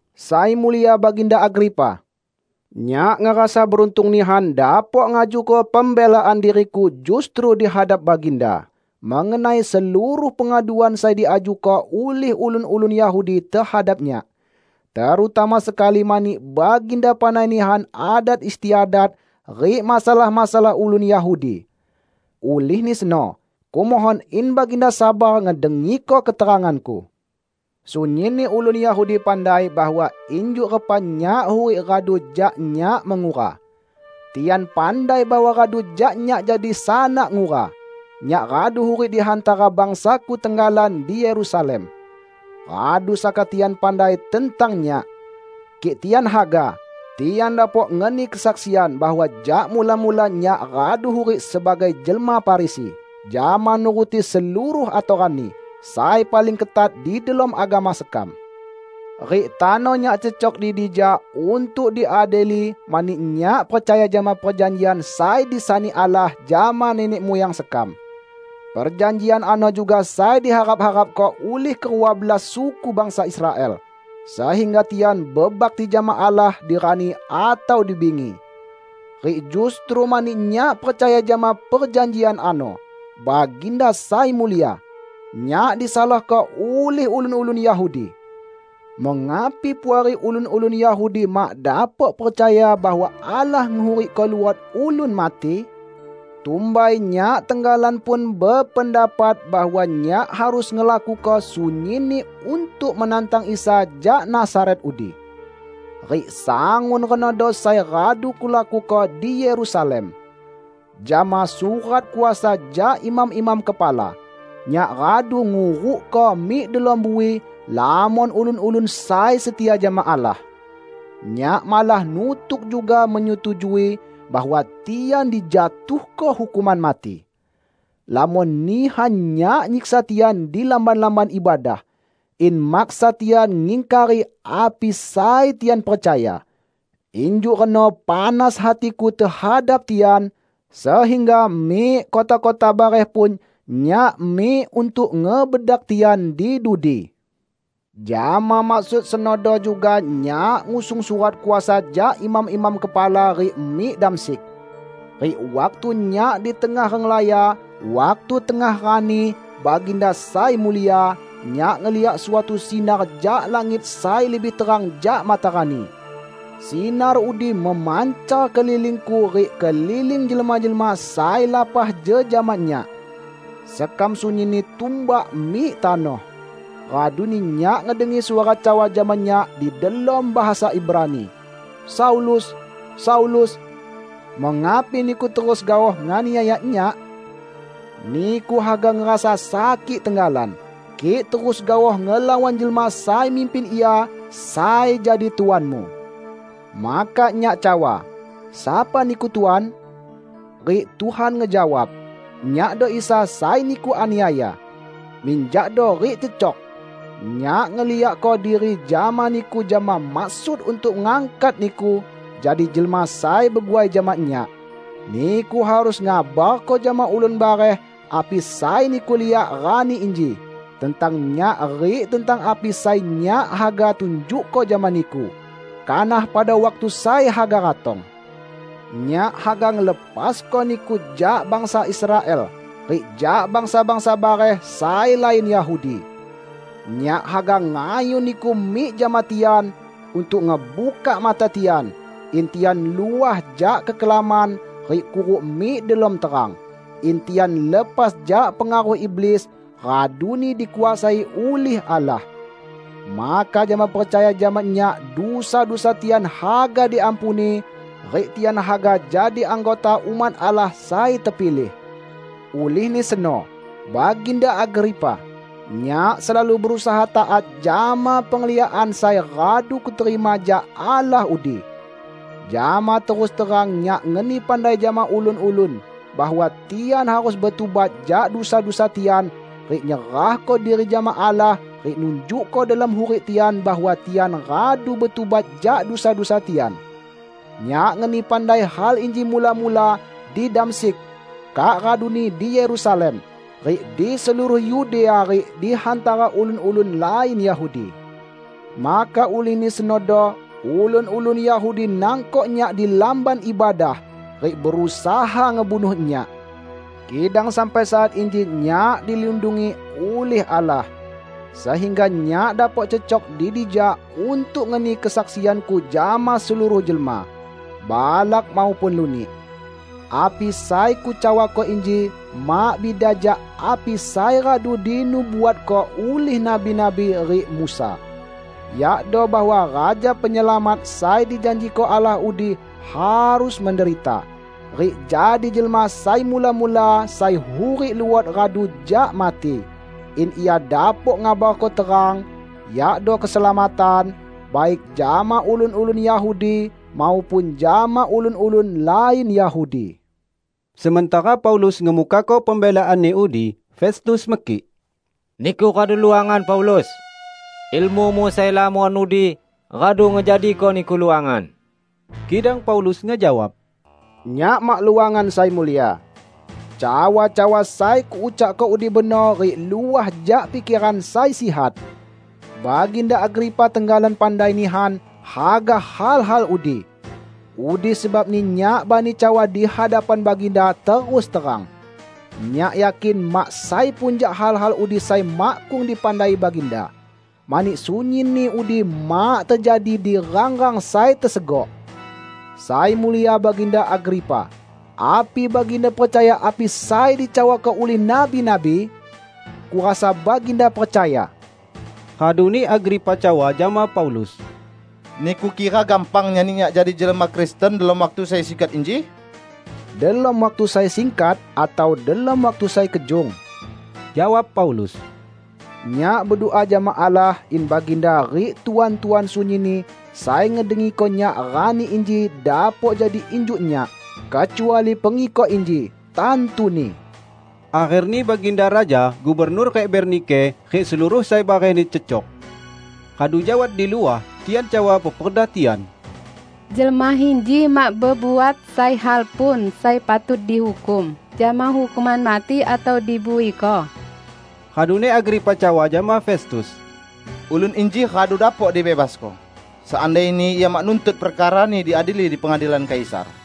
"Sai Mulia Baginda Agripa! Nyak ngerasa beruntung nihan dapok ngajuko pembelaan diriku justru di hadap Baginda mengenai seluruh pengaduan sai diajuko ulih ulun-ulun Yahudi tehadap nyak; terutama sekali mani Baginda pandai nihan adat istiadat rik masalah-masalah ulun Yahudi. Ulihni seno, kumohon in Baginda sabar ngedengiko keteranganku. Sunyinni ulun Yahudi pandai bahwa injuk repa nyak hurik radu jak nyak mengura. Tian pandai bahwa radu jak nyak jadi sanak ngura, nyak radu hurik di hantara bangsaku tenggalan di Yerusalem. Radu saka tian pandai tentang nyak. Kik tian haga, tian dapok ngeni kesaksian bahwa jak mula-mula nyak radu hurik sebagai jelma Farisi jama nuruti seluruh atoranni sai paling ketat di delom agama sekam. Rik tano nyak cecok di dija untuk diadili mani nyak percaya jama perjanjian sai disani Allah jama nenek muyang sekam. Perjanjian ano juga sai diharap-harapko ulih kerua belas suku bangsa Israel, sehingga tian bebakti jama Allah di rani atau di bingi. Rik justru mani nyak percaya jama perjanjian ano, Baginda Sai Mulia, nyak disalahko ulih ulun-ulun Yahudi. Mengapi puari ulun-ulun Yahudi mak dapok percaya bahwa Allah ngehurikko luot ulun mati? Tumbai nyak tenggalan pun bependapat bahwa nyak harus ngelakuko sunyinni untuk menantang Isa jak Nazaret udi. Rik sangun renodo sai radu kulakuko di Yerusalem. Jama surat kuasa jak imam-imam kepala, nyak radu ngurukko mik delom bui lamon ulun-ulun sai setia jama Allah. Nyak malah nutuk juga menyetujui bahwa tian dijatuhko hukuman mati. Lamon nihan nyak nyiksa tian di lamban-lamban ibadah, in maksa tian ngingkari api sai tian percaya. Injuk reno panas hatiku tehadap tian, sehingga mik kota-kota bareh pun nyak mik untuk ngebedak tian di dudi." "Jama maksud senodo juga nyak ngusung surat kuasa jak imam-imam kepala rik mik Damsyik. Rik waktu nyak di tengah renglaya, waktu tengah rani, Baginda Sai Mulia, nyak ngeliak suatu sinar jak langit sai lebih terang jak matarani. Sinar udi memancar kelilingku rik keliling jelma-jelma sai lapah jejama nyak. Sekam sunyinni tumbak mik tanoh. Raduni nyak ngedengi suara cawa jama nyak di delom bahasa Ibrani, 'Saulus, Saulus! Mengapi niku terus gaoh nganiaya Nyak? Niku haga ngerasa sakik tenggalan, kik terus gaoh ngelawan jelma sai mimpin Ia sai jadi tuanmu.' Maka nyak cawa, 'Sapa Niku, Tuan?' Rik Tuhan ngejawab, 'Nyakdo Isa sai niku aniaya. Minjakdo rik cecok! Nyak ngeliakko diri jama niku jama maksud untuk ngangkat niku jadi jelma sai beguai jama Nyak. Niku harus ngabarko jama ulun bareh api sai niku liak rani inji tentang Nyak rik tentang api sai Nyak haga tunjukko jama niku kanah pada waktu sai haga ratong. Nyak haga ngelepasko niku jak bangsa Israel rik jak bangsa-bangsa bareh sai lain Yahudi. Nyak haga ngayun niku mik jama tian untuk ngebukak mata tian, in tian luah jak kekelaman rik kuruk mik delom terang; in tian lepas jak pengaruh iblis, raduni dikuasai ulih Allah. Maka jama percaya jama Nyak dusa-dusa tian haga diampuni rik tian haga jadi anggota umat Allah sai tepilih.' " "Ulihni seno, Baginda Agripa, nyak selalu berusaha taat jama pengliakan sai radu kuterima jak Allah udi. Jama terus terang nyak ngeni pandai jama ulun-ulun bahwa tian harus betubat jak dusa-dusa tian rik nyerahko diri jama Allah rik nunjukko delom hurik tian bahwa tian radu betubat jak dusa-dusa tian. Nyak ngeni pandai hal inji mula-mula di Damsyik, kak raduni di Yerusalem rik di seluruh Yudea rik di hantara ulun-ulun lain Yahudi. Maka ulihni senodo ulun-ulun Yahudi nangkok nyak di Lamban Ibadah rik berusaha ngebunuh nyak. Kidang sampai saat inji nyak dilindungi ulih Allah, sehingga nyak dapok cecok di dija untuk ngeni kesaksianku jama seluruh jelma -- balak maupun lunik. Api sai kucawako inji mak bida jak api sai radu dinubuatko ulih nabi-nabi rik Musa; yakdo bahwa Raja Penyelamat sai dijanjiko Allah udi harus menderita, rik jadi jelma sai mula-mula sai hurik luot radu jak mati; in Ia dapok ngabarko terang -- yakdo keselamatan -- baik jama ulun-ulun Yahudi maupun jama ulun-ulun lain Yahudi." Sementara Paulus ngemukako pembelaanni udi, Festus mekik, "Niku radu luangan Paulus! Ilmumu sai lamon udi radu ngejadiko niku luangan!" Kidang Paulus ngejawab, "Nyak mak luangan, Sai Mulia. Cawa-cawa sai kuucakko udi benor rik luah jak pikeran sai sihat. Baginda Agripa tenggalan pandai nihan haga hal-hal udi. Udi sebabni nyak bani cawa di hadapan Baginda terus terang. Nyak yakin mak sai pun jak hal-hal udi sai makkung dipandai Baginda, mani sunyinni udi mak tejadi di rang-rang sai tesegok. Sai Mulia Baginda Agripa, api Baginda percaya api sai dicawako ulih nabi-nabi? Kurasa Baginda percaya!" Raduni Agripa cawa jama Paulus, "Niku kira gampang nyani nyak jadi jelma Kristen delom waktu sai singkat inji?" "Delom waktu sai singkat atau delom waktu sai kejung," jawab Paulus, "nyak bedua jama Allah in Baginda rik Tuan-tuan sunyinni sai ngedengiko nyak rani inji dapok jadi injuk nyak -- kecuali pengikok inji, tantuni!" Akherni baginda raja, gubernur rik Bernike, rik seluruh sai barehni cecok. Radu jak wat di luah, tian cawa peperda tian, "Jelma inji mak bebuat sai hal pun sai patut dihukum jama hukuman mati atau dibuiko." Raduni Agripa cawa jama Festus, "Ulun inji radu dapok dibebasko, seandaini ia mak nuntut perkarani diadili di pengadilan Kaisar."